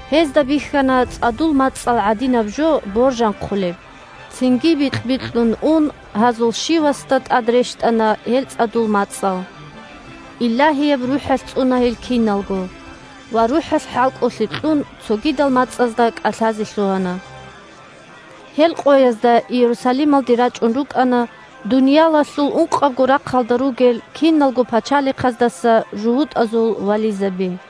Гьезда бихьана цӀадул мацӀал гӀадинаб жо боржанхъулеб, цинги бикь-бикьун ун гьазул щивасда тӀад рещтӀана гьел цӀадул мацӀал. Илагьияб РухӀалъ цӀуна гьел киналго ва, РухӀалъ хӀалкӀолъи кьун, цогидал мацӀазда кӀалъазе лъугьана. Гьел къоязда Иерусалималде рачӀун рукӀана дуниялалъул ункъабго рахъалда ругел киналго пачалихъаздаса жугьутӀазул вализаби.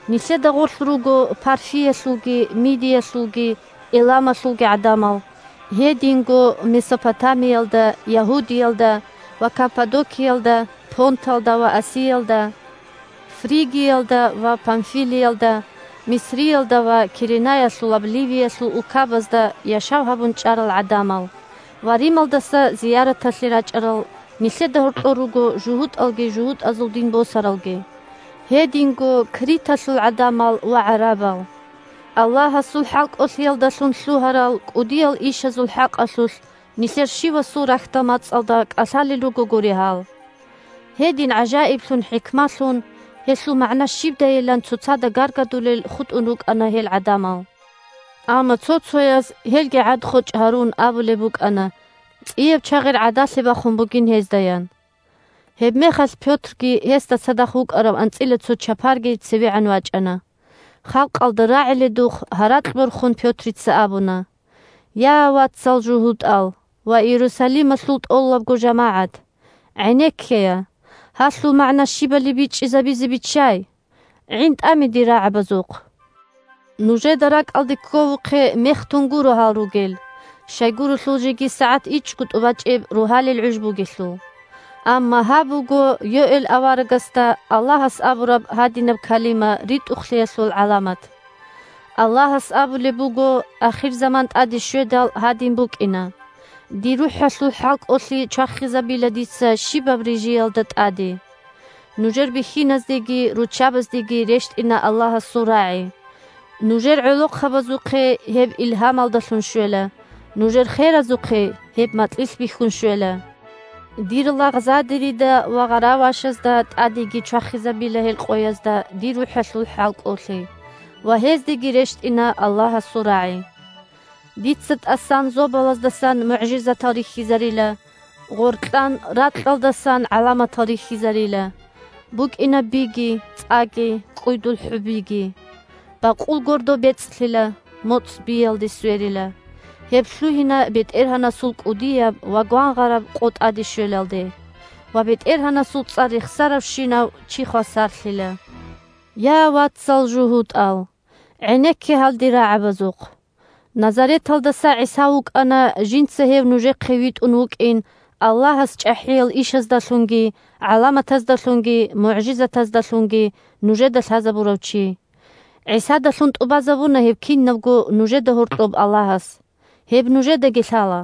Нилъеда гъорлъ руго Парфиялъулги, Мидиялъулги, Эламалъулги гӀадамал, гьединго Месопотамиялда, Ягьудиялда ва Каппадокиялда, Понталда ва Асиялда, Фригиялда ва Памфилиялда, Мисриялда ва Киренаялъулаб Ливиялъул улкабазда яшав гьабун чӀарал гӀадамал ва Рималдаса зияраталъе рачӀарал (нилъеда гьоркьор руго жугьутӀалги жугьутӀазул дин босаралги), гьединго Криталъул гӀадамал ва гӀарабал. Аллагьасул хӀалкӀолъиялдалъун лъугьарал кӀудиял ишазул хӀакъалъулъ нилъер щивасул рахьдал мацӀалда кӀалъалел ругогури гьал! Гьедин гӀажаиблъун-хӀикмалъун, гьелъул магӀна щибдайилан цоцазда гаргадулел хутӀун рукӀана гьел гӀадамал. Амма цо-цояз, гьелги гӀад-хочӀ гьарун, абулеб букӀана цӀияб чагъир гӀадалъе бахун бугин гьездаян. Гьебмехалъ Пётрги гьесда цадахъ вукӀарав анцӀила цо чапарги цевегӀан вачӀана. Халкъалда рагӀиледухъ гьаракь борхун Пётрица абуна: – Я, вацал жугьутӀал ва Иерусалималъул тӀолабго жамагӀат! ГӀенеккея! Гьалъул магӀна щибали бичӀчӀизабизе биччай! ГӀинтӀаме дир рагӀабазухъ! Нужеда ракӀалде кковухъе, мехтун гуро гьал ругел. Щайгурелъул жеги сагӀат ичӀго тӀубачӀеб рогьалил гӀуж бугелъул. Амма гьаб буго Йоэл аварагасда Аллагьас абураб гьадинаб калима ритӀухълъиялъул гӀаламат: «Аллагьас абулеб буго: Ахирзаман тӀаде щведал, гьадин букӀина – Дир РухӀалъул хӀалкӀолъи чвахизабила дица щибаб рижиялда тӀаде. Нужер бихьиназдеги руччабаздеги рещтӀина Аллагьасул рагӀи, нужер гӀолохъабазухъе гьеб илгьамалдалъун щвела, нужер херазухъе гьеб макьилъ бихьун щвела. Дир лагъзадерида ва гъаравашазда тӀадеги чвахизабила гьел къоязда Дир РухӀалъул хӀалкӀолъи, ва гьездеги рещтӀина Аллагьасул рагӀи. Дица тӀасан зобалаздасан мугӀжизатал рихьизарила, гъоркьан ракьалдасан гӀаламатал рихьизарила. БукӀина биги, цӀаги, кӀкӀуйдул хӀубиги. Бакъул гордо бецӀлъила, моцӀ биялде сверила. Гьеб лъугьина БетӀергьанасул кӀудияб ва гвангъараб къо тӀаде щвелалде. Ва БетӀергьанасул цӀар рехсаравщинав чи хвасарлъила». Я, вацал жугьутӀал! ГӀенекке гьал дир рагӀабазухъ. Назареталдаса ГӀиса вукӀана жинца гьев нужехъе витӀун вукӀин Аллагьас чӀахӀиял ишаздалъунги, гӀаламатаздалъунги, мугӀжизатаздалъунги нужеда лъазабурав чи. ГӀисадалъун тӀубазабуна гьеб кинабго нужеда гьоркьоб Аллагьас. Гьеб нужедаги лъала.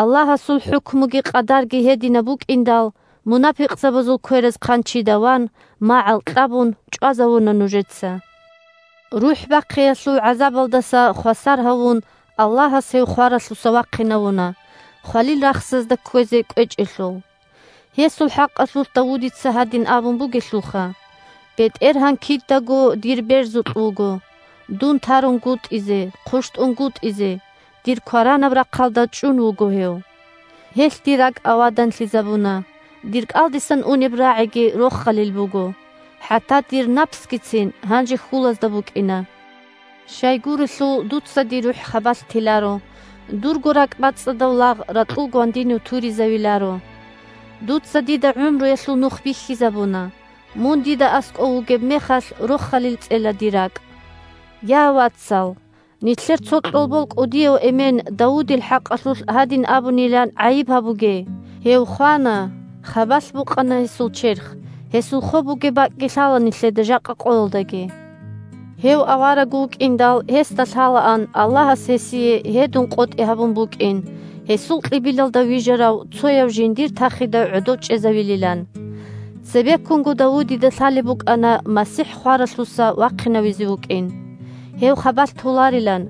Аллагьасул хӀукмуги къадарги гьединаб букӀиндал, мунапикъазул квераз хъанчида ван, магӀал кьабун, чӀвазавуна нужеца. РухӀ бахъиялъул гӀазабалдаса хвасар гьавун, Аллагьас гьев хваралъуса вахъинавуна, хвалил рахсазда кквезе кӀвечӀелъул. Гьесул хӀакъалъулъ Давудица гьадин абун бугелъулха: «БетӀергьан кидаго дир берзукь вуго. Дун тарунгутӀизе, хъущтӀунгутӀизе дир кваранаб рахъалда чӀун вуго гьев. Гьелъ дир ракӀ аваданлъизабуна. Дир кӀалдисан унеб рагӀиги рохалилаб буго. ХӀатта дир напсгицин гьанже хьулазда букӀина. Щайгурелъул дуца дир рухӀ хабалъ теларо, дурго ракӀбацӀцӀадав лагъ ракьул гвандинив туризавиларо. Дуца дида гӀумруялъул Нух бихьизабуна. Мун дида аскӀов вугеб мехалъ рохалил цӀела дир ракӀ». Я, вацал! Нилъер цо кьолбол кӀудияв эмен Давудил хӀакъалъулъ гьадин абунилан гӀайиб гьабуге: гьев хвана, хабалъ букъана гьесул черх, гьесул хоб бугеб бакӀги лъала нилъеда жакъа къоялдаги. Гьев авараг вукӀиндал, гьесда лъалаан Аллагьас гьесие гьедун къотӀи гьабун букӀин гьесул кьибилалда вижарав цояв жиндир тахида гӀодов чӀезавилилан. Цебеккунго Давудида лъалеб букӀана МасихӀ хваралъуса вахъинавизе вукӀин: гьев хабалъ толарилан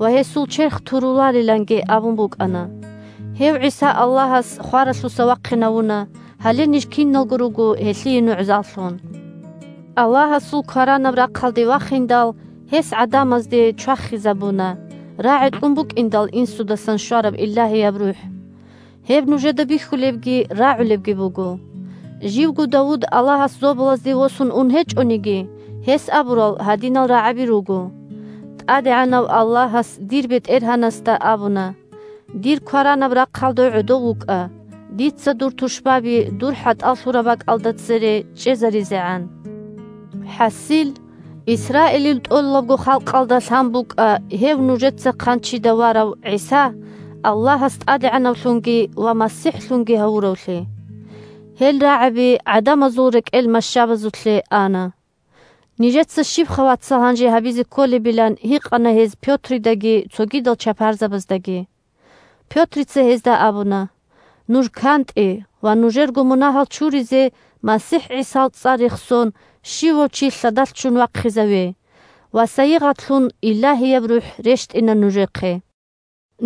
ва гьесул черх туруларинги абун букӀана. Гьев ГӀиса Аллагьас хваралъуса вахъинавуна, гьале ниж киналго руго гьелъие нугӀзаллъун. Аллагьасул кваранаб рахъалде вахиндал, гьес гӀадамазде чвахизабуна, рагӀи кьун букӀиндал Инсудасан щвараб Илагьияб РухӀ. Гьеб нужеда бихьулебги рагӀулебги буго. Живго Давуд Аллагьас зобалазде восун ун гьечӀониги, гьес абурал гьадинал рагӀаби руго: «ТӀадегӀанав Аллагьас дир БетӀергьанасда абуна: „Дир кваранаб рахъалда гӀодов вукӀа, дица дур тушбаби дур хӀатӀал лъураб бакӀалда цере чӀезаризегӀан“». ХӀасил, Исраилил тӀолабго халкъалда лъан букӀа гьев нужеца хъанчида варав ГӀиса Аллагьас ТӀадегӀанавлъунги ва МасихӀлъунги гьавуравлъи. Гьел рагӀаби гӀадамазул рекӀел мащабазулъе ана. Нижеца щибха, вацал, гьанже гьабизе кколебилан гьикъана гьез Пётридаги цогидал чапарзабаздаги. Пётрица гьезда абуна: – Нуж кантӀе ва нужерго мунагьал чуризе, МасихӀ ГӀисал цӀар рехсон, щивав чи лъадалъ ччун вахъизаве, ва сайигъатлъун Илагьияб РухӀ рещтӀина нужехъе.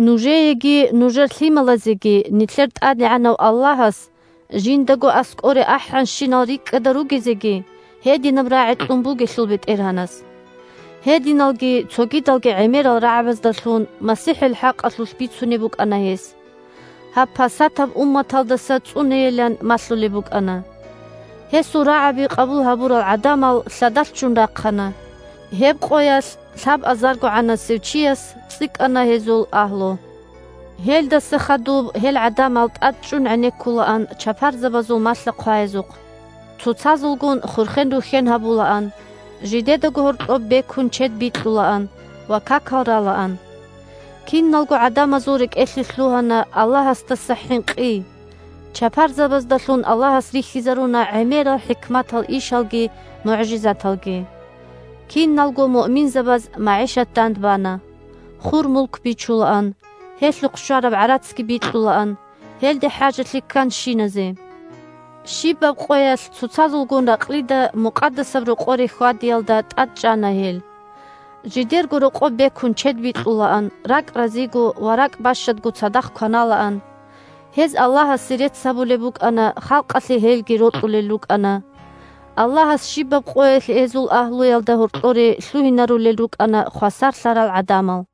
Нужееги, нужер лъималазеги, нилъер ТӀадегӀанав Аллагьас жиндаго аскӀоре ахӀанщинал рикӀкӀада ругезеги, гьединаб рагӀи кьун бугелъул БетӀергьанас. Гьединалги цогидалги гӀемерал рагӀабаздалъун МасихӀил хӀакъалъулъ бицунеб букӀана гьес. Гьаб пасатаб умматалдаса цӀунейилан малъулеб букӀана. Гьесул рагӀаби къабул гьабурал гӀадамал лъадалъ ччун рахъана. Гьеб къоялъ лъабазаргогӀанасев чияс цӀикӀкӀана гьезул агьлу. Гьелдаса хадуб гьел гӀадамал тӀадчӀун гӀенеккулаан чапарзабазул малъа-хъваязухъ, цоцазулгун хурхен-рухьен гьабулаан, жидедаго гьоркьоб бекун чед бикьулаан ва какал ралаан. Киналго гӀадамазул рекӀелъе лъугьана Аллагьасдаса хӀинкъи: чапарзабаздалъун Аллагьас рихьизаруна гӀемерал хӀикматал ишалги мугӀжизаталги. Киналго муъминзабаз магӀишат дандбана. Хур-мулк бичулаан, гьелъухъ щвараб гӀарацги бикьулаан гьелде хӀажалъи кканщиназе. Щибаб къоялъ цоцазулгун ракълида Мукъадасаб Рокъоре хьвадиялда тӀадчӀана гьел. Жидерго рокъоб бекун чед бикьулаан, ракӀ разиго ва ракӀ бащадго цадахъ кваналаан. Гьез Аллагьасе рецц гьабулеб букӀана, халкъалъе гьелги рокьулел рукӀана. Аллагьас щибаб къоялъ гьезул агьлуялда гьоркьоре лъугьинарулел рукӀана хвасарлъарал гӀадамал.